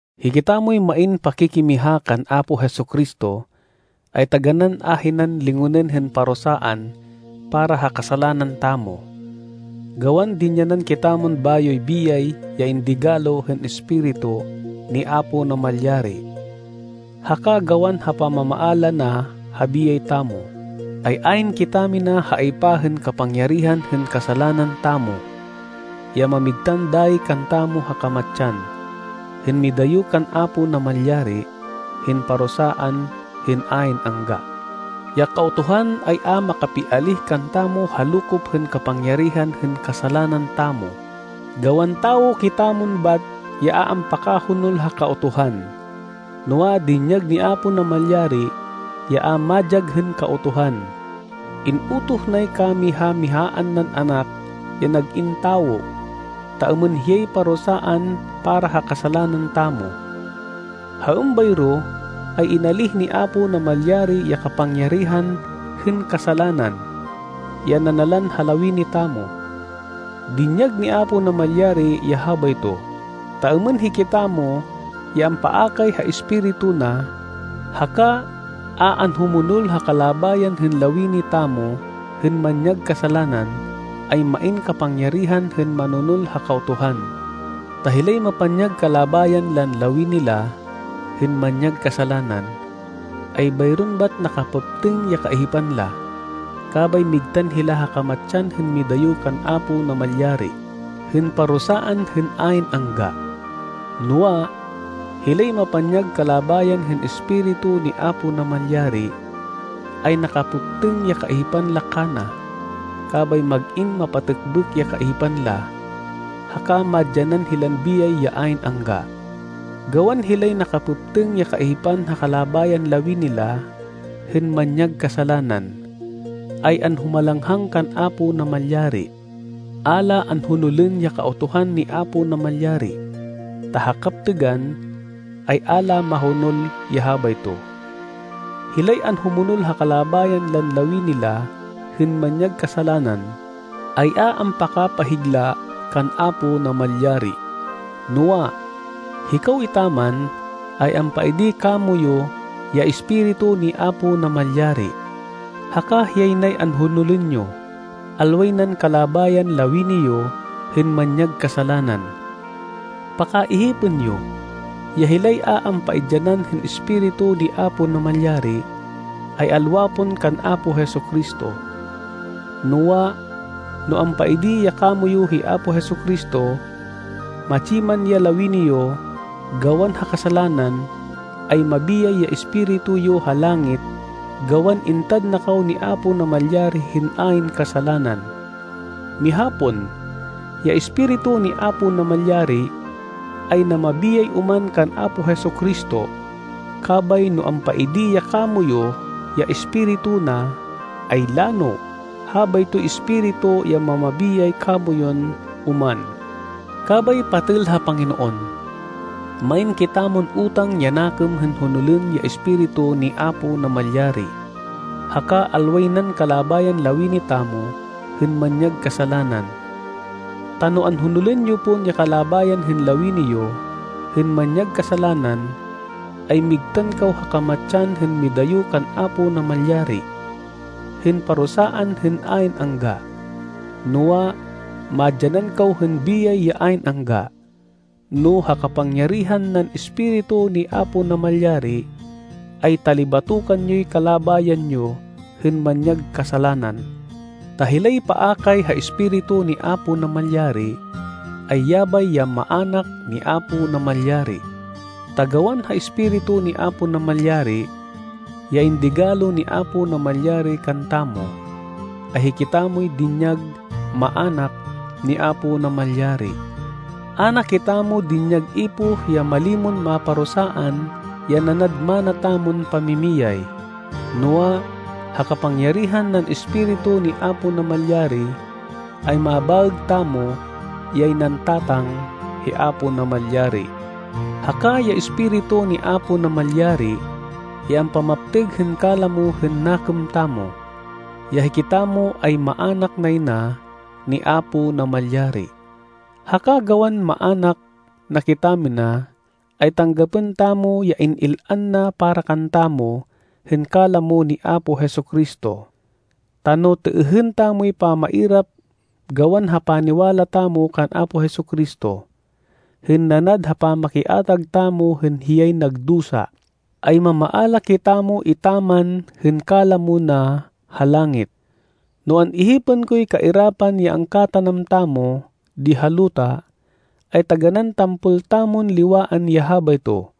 Hikitamoy main pakikimiha kan Apo Jesu-Cristo, ay taganán ahinan lingonên hên parusaan para ha kasalanan tamo. Gawan dinyanan kitamon bayoy biyay ya indigalo hên Espiritu ni Apo Namalyari, haka gawan ha pamamaala na ha biyay tamo, ay ayn kitamina ha aypa hên kapangyarihan hên kasalanan tamo, ya mamigtan dayi kantamo ha kamatsan, hên midayo kan Apo Namalyari, hên parusaan hên ayn angga. Ya Kautuhan ay a makapialíh kantamo ha lokop hên kapangyarihan hên kasalanan tamo, gawan tawo kitamon bat ya a ampakahonol ha Kautuhan. Noa, dinyag ni Apo Namalyari ya a madyag hên Kautuhan. In-utoh nay kamiha-mihaan nan Anak ya nag-in tawo, ta êmên hiyay parusaan para ha kasalanan tamo. Ha êmbayro ay inalíh ni Apo Namalyari ya kapangyarihan hên kasalanan, ya nanalan ha lawini tamo. Dinyag ni Apo Namalyari ya habayto, ta êmên hikitamo ya ampaakay ha Espiritu na, haka a anhumonol ha kalabayan hên lawini tamo hên manyag kasalanan, ay main kapangyarihan hên manonol ha Kautuhan. Ta hilay mapanyag kalabayan lan lawini la hên manyag kasalanan, ay bayron bat nakapêptêng ya kaihipan la, kabay migtan hila ha kamatsan hên midayo kan Apo Namalyari, hên parusaan hên ayn angga. Noa, hilay mapanyag kalabayan hên Espiritu ni Apo Namalyari, ay nakapêptêng ya kaihipan la kana, kabay mag-in mapatêkbêk ya kaihipan la, haka madyanan hilan biyay ya ayn angga. Gawan hilay nakapêptêng ya kaihipan ha kalabayan lawini la hên manyag kasalanan, ay anhumalanghang kan Apo Namalyari. A la anhonolên ya Kautuhan ni Apo Namalyari, ta ha kaptêgan, ay a la mahonol ya habayto. Hilay anhumonol ha kalabayan lan lawini la hên manyag kasalanan, ay a ampakapahigla kan Apo Namalyari. Noa, hikaw etaman, ay ampaidi kamoyu ya Espiritu ni Apo Namalyari, haka hiyay nay anhonolên yo, alway nan kalabayan lawini yo hên manyag kasalanan. Pakaihipên yo, ya hilay a ampaidyanan hên Espiritu ni Apo Namalyari, ay alwa pon kan Apo Jesu-Cristo. Noa, no ampaidi ya kamoyu hi Apo Jesu-Cristo, matsi man ya lawini yo, gawan ha kasalanan, ay mabiyay ya espiritu yo ha langit gawan intad na kaw ni Apo Namalyari hên ayn kasalanan. Miha pon, ya Espiritu ni Apo Namalyari, ay namabiyay oman kan Apo Jesu-Cristo, kabay no ampaidi ya kamoyu ya Espiritu na, ay lano, habaytoy Espiritu ya mamabiyay kamoyun oman. Kabay patêl ha Panginoon, main kitamon utang ya nakêm hên honolên ya Espiritu ni Apo Namalyari, haka alway nan kalabayan lawini tamo hên manyag kasalanan. Ta no anhonolên yo pon ya kalabayan hên lawini yo hên manyag kasalanan, ay migtan kaw ha kamatsan hên midayo kan Apo Namalyari, hên parusaan hên ayn angga. Noa, madyanan kaw hên biyay ya ayn angga, no ha kapangyarihan nan Espiritu ni Apo Namalyari, ay talibatokan yoy kalabayan yo hên manyag kasalanan. Ta hilay paakay ha Espiritu ni Apo Namalyari ay yabay ya maának ni Apo Namalyari. Ta gawan ha Espiritu ni Apo Namalyari, ya indigalo ni Apo Namalyari kantamo, ay hikitamoy dinyag maának ni Apo Namalyari. A na kitamo dinyag ipoh ya malimon maparusaan ya nanad mana tamon pamimiyay. Noa, ha kapangyarihan nan Espiritu ni Apo Namalyari, ay mabaêg tamo yay nan Tatang hi Apo Namalyari. Haka ya Espiritu ni Apo Namalyari ya ampamaptêg hên kalamo hên nakêm tamo, ya hikitamo ay maának nay na ni Apo Namalyari. Haka gawan maának na kitamina, ay tanggapên tamo ya in-il-an na para kantamo hên kalamo ni Apo Jesu-Cristo. Ta no têêhên tamoy pamairap gawan ha paniwala tamo kan Apo Jesu-Cristo, hên nanad ha pamakiatag tamo hên hiyay nagdusa, ay mamaala kitamo etaman hên kalamo na ha langit. No an-ihipên koy kairapan ya angkatanam tamo di ha luta, ay taganán tampol tamon liwaan ya habayto,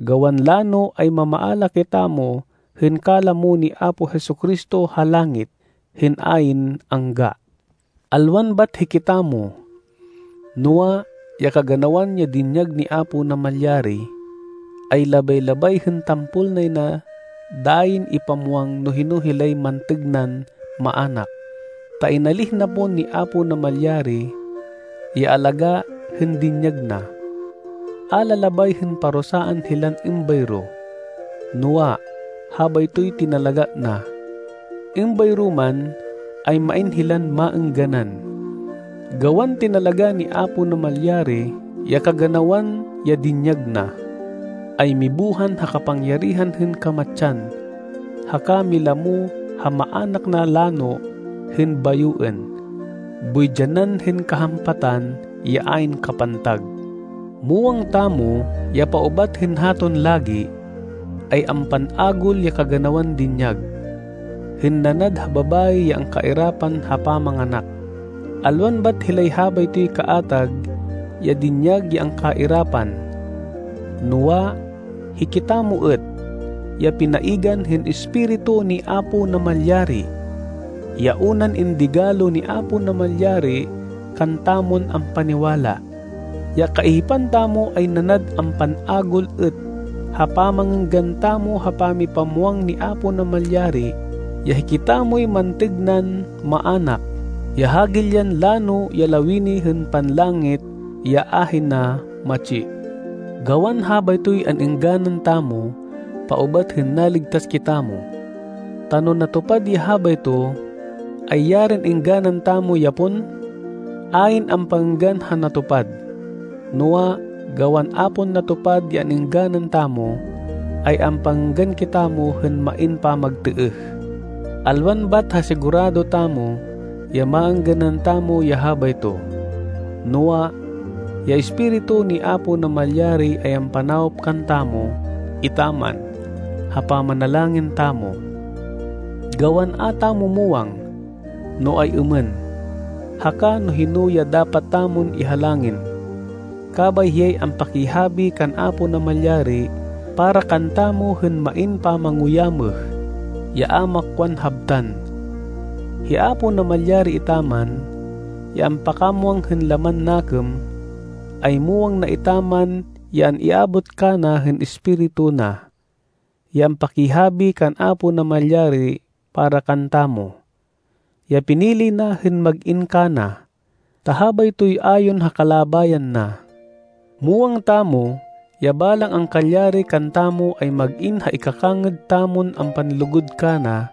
gawan lano ay mamaala kitamo hên kalamo ni Apo Jesu-Cristo ha langit hên ayn angga. Alwan bat hikitamo noa, ya kaganawan ya dinyag ni Apo Namalyari, ay labay-labay hên tampol nay na dayin ipamwang no hino hilay mantêg nan maának. Ta inalíh na pon ni Apo Namalyari ya alagá hên dinyag na. A la labay hên parusaan hilan êmbayro, noa, habaytoy tinalagá na. Êmbayro man, ay main hilan maêngganan, gawan tinalagá ni Apo Namalyari ya kaganawan ya dinyag na, ay mibuhan ha kapangyarihan hên kamatsan, haka milamo ha maának na lano hên bayoên, boy dyanan hên kahampatan ya ayn kapantag. Muwang tamo ya paubat hên haton lagi, ay ampan-agul ya kaganawan dinyag, hên nanad ha babayi ya angkairapan ha pamanganak. Alwan bat hilay habaytoy kaatag ya dinyag ya angkairapan, noa, hikitamo êt, ya pinaigan hên Espiritu ni Apo Namalyari, ya unan indigalo ni Apo Namalyari kantamon ampaniwala. Ya kaihipan tamo ay nanad ampan-agul êt ha pamangênggan tamo ha pamipamwang ni Apo Namalyari ya hikitamoy mantêg nan maának, ya hagilyan lano ya lawini hên panlangit ya ahina matsi. Gawan habaytoy an-êngganan tamo paubat hên naligtas kitamo. Ta no natupad ya habayto, ay yarin êngganan tamo ya pon! Ayn ampangênggan ha natupad. Noa, gawan a pon natupad ya an-êngganan tamo, ay ampangênggan kitamo hên main pamagtêêh. Alwan bat ha sigurado tamo ya maêngganan tamo ya habayto, noa, ya Espiritu ni Apo Namalyari ay ampanawop kantamo etaman ha pamanalangin tamo, gawan a tamo muwang, no ay-êmên, haka no hino ya dapat tamon ihalangin. Kabay hiyay ampakihabi kan Apo Namalyari para kantamo hên main pamanguyámêh, ya a makwan habtan. Hi Apo Namalyari etaman, ya ampakamwang hên laman nakêm, ay muwang na etaman ya an-iabot kana hên Espiritu na, ya ampakihabi kan Apo Namalyari para kantamo, ya pinili na hên mag-in kana, ta habaytoy ayon ha kalabayan na. Muwang tamo ya balang angkalyari kantamo ay mag-in ha ikakangêd tamon ampanlugud kana,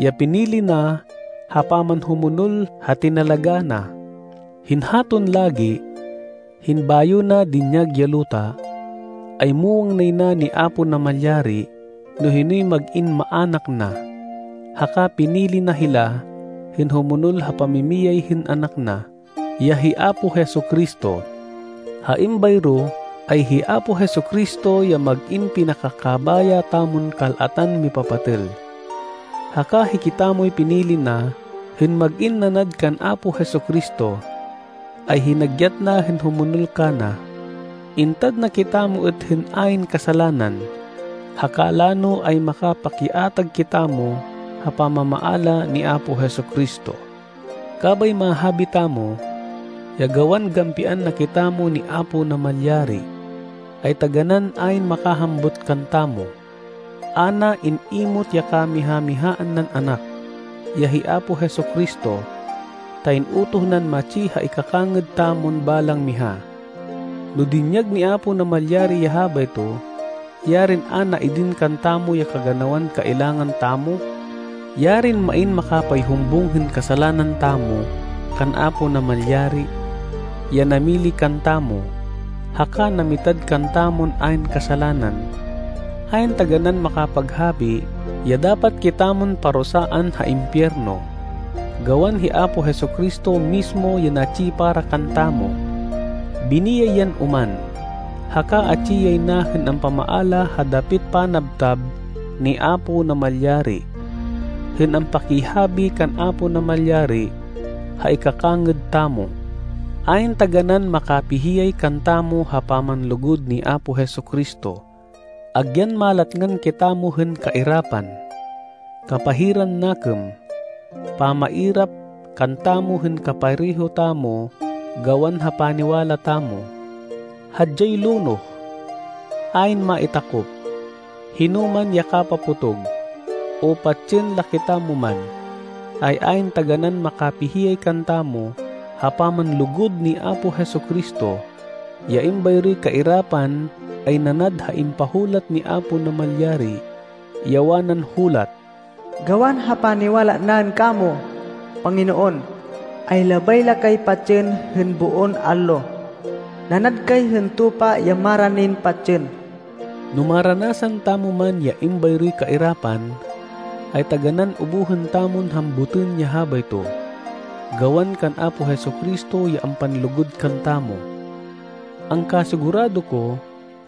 ya pinili na ha pamanhumonol ha tinalagá na. Hên haton lagi, hên bayo na dinyag ya luta, ay muwang nay na ni Apo Namalyari no hinoy mag-in maának na, haka pinili na hila hên humonol ha pamimiyay hên Anak na, ya hi Apo Jesu-Cristo. Ha êmbayro ay hi Apo Jesu-Cristo ya mag-in pinakakabaya tamon kal-atan mipapatêl. Haka hikitamoy pinili na hên mag-in nanad kan Apo Jesu-Cristo, ay hinagyat na hên humonol kana. Intad na kitamo êt hên ayn kasalanan, haka lano ay makapakiatag kitamo ha pamamaala ni Apo Jesu-Cristo. Kabay mahabi tamo, ya gawan gampian na kitamo ni Apo Namalyari, ay taganán ayn makahambut kantamo! A na in-imot ya kamiha-mihaan nan Anak, ya hi Apo Jesu-Cristo, ta in-utoh nan matsi ha ikakangêd tamon balang miha. No dinyag ni Apo Namalyari ya habayto, yarin a na idin kantamo ya kaganawan kailangan tamo! Yarin main makapayhumbung hên kasalanan tamo kan Apo Namalyari, ya namili kantamo, haka namitad kantamon ayn kasalanan! Ayn taganán makapaghabi ya dapat kitamon parusaan ha impiyerno, gawan hi Apo Jesu-Cristo mismo ya natsi para kantamo! Biniyay yan oman, haka atsi yay na hên ampamaala ha dapit panabtab ni Apo Namalyari, hên ampakihabi kan Apo Namalyari ha ikakangêd tamo. Ayn taganán makapihiyay kantamo ha pamanlugud ni Apo Jesu-Cristo! Agyan malatngan kitamo hên kairapan, kapahiran nakêm, pamairap kantamo hên kapareho tamo gawan ha paniwala tamo, hadyay lonoh, ayn maitakop, hinoman ya kapapotog, o patsên la kitamo man, ay ayn taganán makapihiyay kantamo ha pamanlugud ni Apo Jesu-Cristo. Ya êmbayroy kairapan ay nanad ha impahulat ni Apo Namalyari, ya wanan hulat, “Gawan ha paniwala naên kamo, Panginoon, ay labay la kay patsên hên boon allo. Nanad kay hên tupa ya maranin patsên.” No maranasan tamo man ya êmbayroy kairapan, ay taganán ubuhên tamon hambutên ya habayto, gawan kan Apo Jesu-Cristo ya ampanlugud kantamo. Angkasigurado ko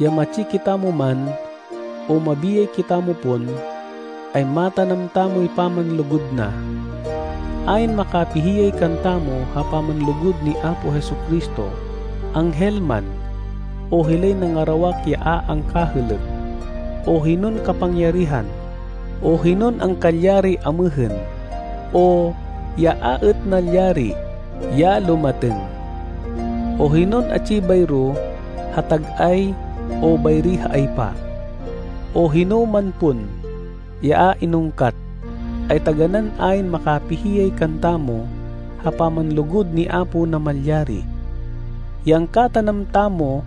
ya matsi kitamo man, o mabiyay kitamo pon, ay matanam tamoy pamanlugud na. Ayn makapihiyay kantamo ha pamanlugud ni Apo Jesu-Cristo, anghel man, o hilay nangarawak ya a angkahêlêk, o hinon kapangyarihan, o hinon angkalyari amêhên, o ya a êt nalyari, ya lumatêng, o hinon atsi bayro ha tag-ay o bayri ha aypa, o hinoman pon ya a inungkat, ay taganán ayn makapihiyay kantamo ha pamanlugud ni Apo Namalyari, ya angkatanam tamo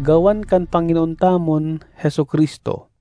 gawan kan Panginoon tamon Jesu-Cristo.